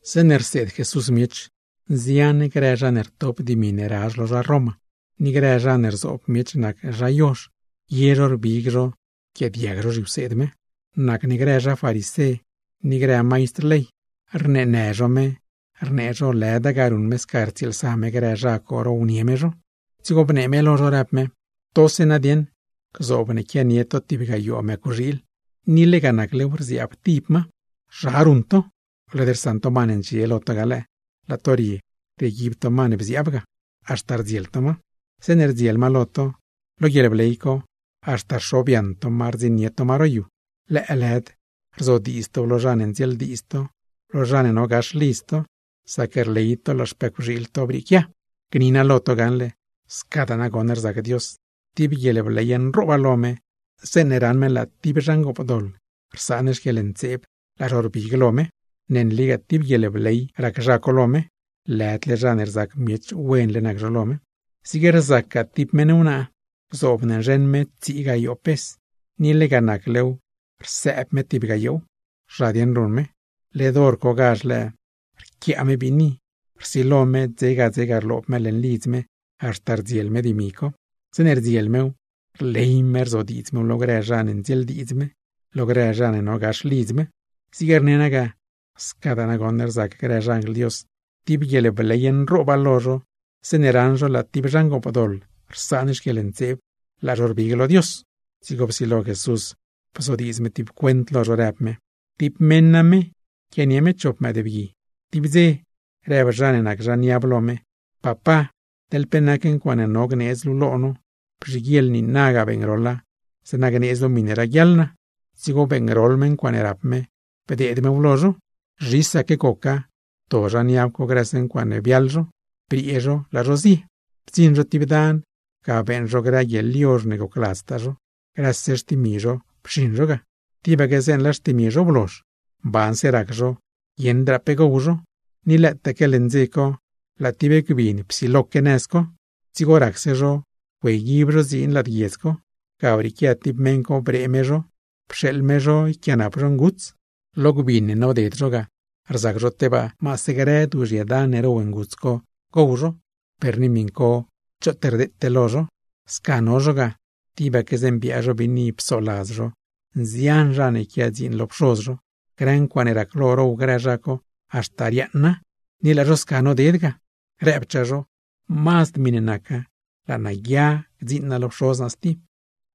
Zeeṉe rseed Jesús miech, nzian grë zha ne rtop dimi ne razh lo zha Roma, ni grë zha ne rzoob miech nac zha yozh, ye zho rbig zho rquiaadiag zho zhiwseed me. Nacne grë zha farisé ni grë maistr ley, rneenë zho me, rnee zho lëda ga ruṉ me sca rtsieelsa me grë zha co, rownie me zho. Dzigo bnee me lo zho, rëb me: ―Togase nadieṉ, gzoob ne quianie to tib gayoo mëcwxiil, ni lega naclew rziaab tib ma, ¿zha dieṉ ruṉ to? Led rsaṉ to ma ne ndxie lo to ga lëë, laa to rie rieguib to ma ne bziaab ga, haxta rdziel to ma. Zeeṉe rdziel ma lo to, lo guieḻbley co haxta rxobyaṉ to ma rdziṉnie to ma ro yu. Lëëlëd rzodiidz tow lo zha ne ndzieeldiidz to, lo zha ne no gax lidz to, sac rley to laa xpëcwxiil to brieequia. Gni naa lo to gaṉle, scadaa nagoṉ rzac Dios, tib guieḻbley nrooba lo me, zeeṉe raṉ me laa tib zha ngoopdoḻ rsaan xquieḻntseeb, laa zho rbig lo me. Ne nligaa tib guieḻbley rac zha co lo me, lëdle zha ne rzac miech wenle nac zho lo me. ’Zig rzacgaa tib meṉ wnaa, gzoob ne nzheṉ me tsii gayoo pes, ni lega naclew rsëëb me tib gayoow, ¿zha dieṉ ruṉ me? Led hor cogazh lëë rquiaa me biini, rsilo me dzega dzega rloob me leṉ lidz me haxta rdziel me dimi co. Zeeṉe rdziel mew, rley me rzodiidz mew lo grë zha ne ndzieeldiidz me, lo grë zha ne no gax lidz me. Zig rne naa ga, scadaa nagoṉ rzac grë xanjl Dios, tib guieḻbley nrooba lo zho zeeṉe raṉ zho laa tib zha ngoopdoḻ rsaan xquieḻntseeb, laa zho rbig lo Dios. Dzigo psilo Jesús bzodiidz me tib cuent lo zho, rëb me: ―Tib meṉ name quianie me chop mëëdbgui. Tib dze, rëb zha ne nac zha niab lo me: “Papá, teḻ pe nac ncuaaṉe no gneedz luu lo no, bzhiguieḻ niinaga beeṉgroḻa, zeeṉa gneedz luu miṉe raguiaḻ naa.” Dzigo beeṉgroḻ me ncuaaṉe rap me, bdeed mew lo zho. ’Zhisaque goca, pto zha niab co grëse ncuaaṉe biaḻ zho, briee zho laa zho zie. Bdziṉ zho stib dan, ga beeṉ zho grë guieḻyozh ne gocladztaa zho, grëse xtimi zho pxiṉ zho ga. Tibaque zeeṉe laa xtimi zho blozh, mbanse rac zho guieṉdraa pe gow zho, ni lëëtaque leṉ dze co laa tib gbin psiloque nëz co. Dzigo racse zho güeyguib zho dziin lad guiedz co, ga brieequia tib meṉ co bree zho, pxeeḻ me zho yquiaanap zho nguts. Lo gbin ne noded zho ga, rzac zho tebaa cho gdeed maase grë duuzhye dan ne row grë nguts co gow zho, per ni miṉ co choot rdeete lo zho. ’Sca no zho ga, tibaque zeeṉe biaa zho biini psoladz zho nzian zha ne quia dziin lo pxoz zho, grë ncuaaṉe raclo row grë zha co, haxta riaaṉa, ni laa zho sca noded ga; rëbchaa zho: “Mazd miṉe naca laa naa guia gdziiṉ naa lo pxoz naa stib,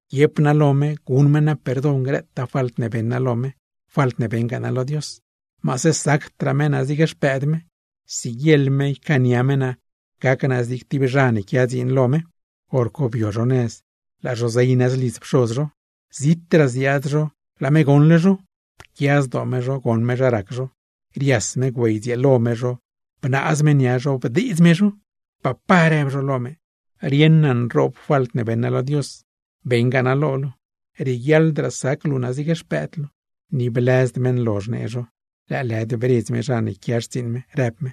guiep naa lo me guṉ me naa perdon grëtaa falt ne beṉ naa lo me, falt ne beṉgaa naa lo Dios. Maase sacdraa me naa zig xpëëd me, siguieḻ me ycaania me naa gac naa zig tib zha ne quiase dziin lo me.” Horco bio zho nëz laa zho zey nëz lidz pxoz zho. Zitraa ziaad zho laa me goṉle zho, pquia zdoo me zho goṉ me zha rac zho; rias me güeydzieelo me zho bnaaz me nia zho, bdeedz me zho. ’“Papá”, rëb zho lo me, “rieṉ naa nroob falt ne beṉ naa lo Dios, beṉgaa naa lo luu. Rieguiaḻdraa sac luu naa zig tib xpëëd luu.” ’Ni blëzd me nlozh nee zho, lëëlëd bredz me zha ne quia xtsiiṉ me, rëb me: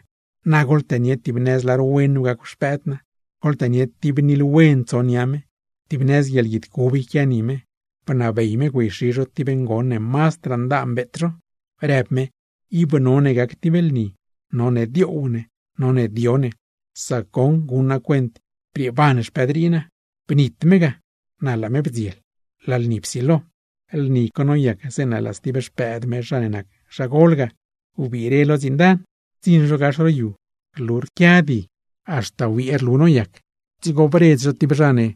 “¡Na goḻtënie tib nëz lar wen nu gacw xpëëd naa! ¡Goḻtënie tib nil wen tso nia me, tib nëz guieḻguid cub yquia ni me!” Bnabey me zho güeyxi zho tib ngon ne mazdraa ndaan, beet zho, rëb me: “¡Ib none gac tib lni, none dioow ne, none dio ne! ¡Sac goṉ guṉ naa cuent, brieeban xpëëd rii naa! ¡Bnitle me ga, na laa me bdziel!” ¡Laa lni psilo! ’Lni co noyac, zeeṉe laa stib xpëëd me zha ne nac zha gol ga, wbire lo dziin dan. Bdziṉ zho gax ro yu, rlu rquia di, haxta wiee rlu noyac; dzigo bredz zho tib zha ne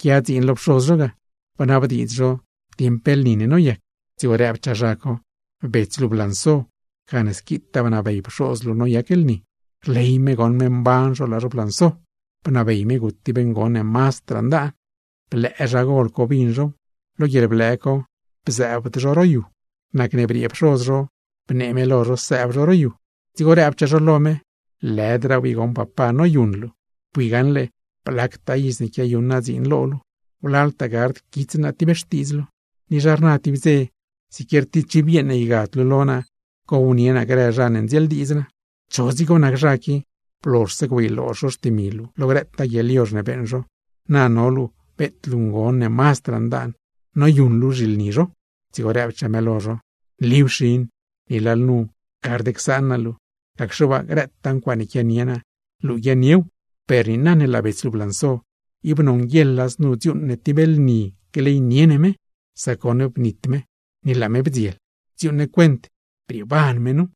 quia dziin lo pxoz zho ga, bnabdiidz zho dieṉ pe lni ne noyac. Dzigo rëbchaa zha co: “Bets luu blanso, gane squitaa bnabey pxoz luu noyac lni; rley me goṉ me mban zho laa zho blanso. Bnabey me gut tib ngon ne mazdraa ndaan.” Blëë zha gol co bin zhow, lo guieḻblëë co bzëëbd zho ro yu. Nacne briee pxoz zho, bnee me lo zho sëëb zho ro yu. Dzigo rëbchaa zho lo me: “¡Lëdraaw i goṉ papá noyuṉ luu! Bui gaṉle blactaa iz ne quiayuṉ naa dziin lo luu, wlaltaa gard quits naa tib xtiidz luu. Ni zha rna tib dze, siquier tib chiv yeeṉ ygad luu lo naa, gownie naa grë zha ne ndzieeldiidz naa. Cho dzigo nac zha qui, blozhse güeyloozh zho xtimi luu lo grëtaa guieḻyozh ne beeṉ zho, na no luu beet luu ngon ne mazdraa ndaan, noyuṉ luu zhilni zho.” Dzigo rëbchaa me lo zho: “Nliw xin, ni lalnu gard csaan luu naa, gacxe waa grëtaa ncuaaṉe quianie naa, luu guiaaṉniew. Per niina ne laa bets luu blanso, ib nonguieḻa znu dziuuṉ ne tib lni gleynie ne me; sac goṉ bnit me, ni na laa me bdziel. ¡Dziuuṉ ne cuent brieeban me nu!”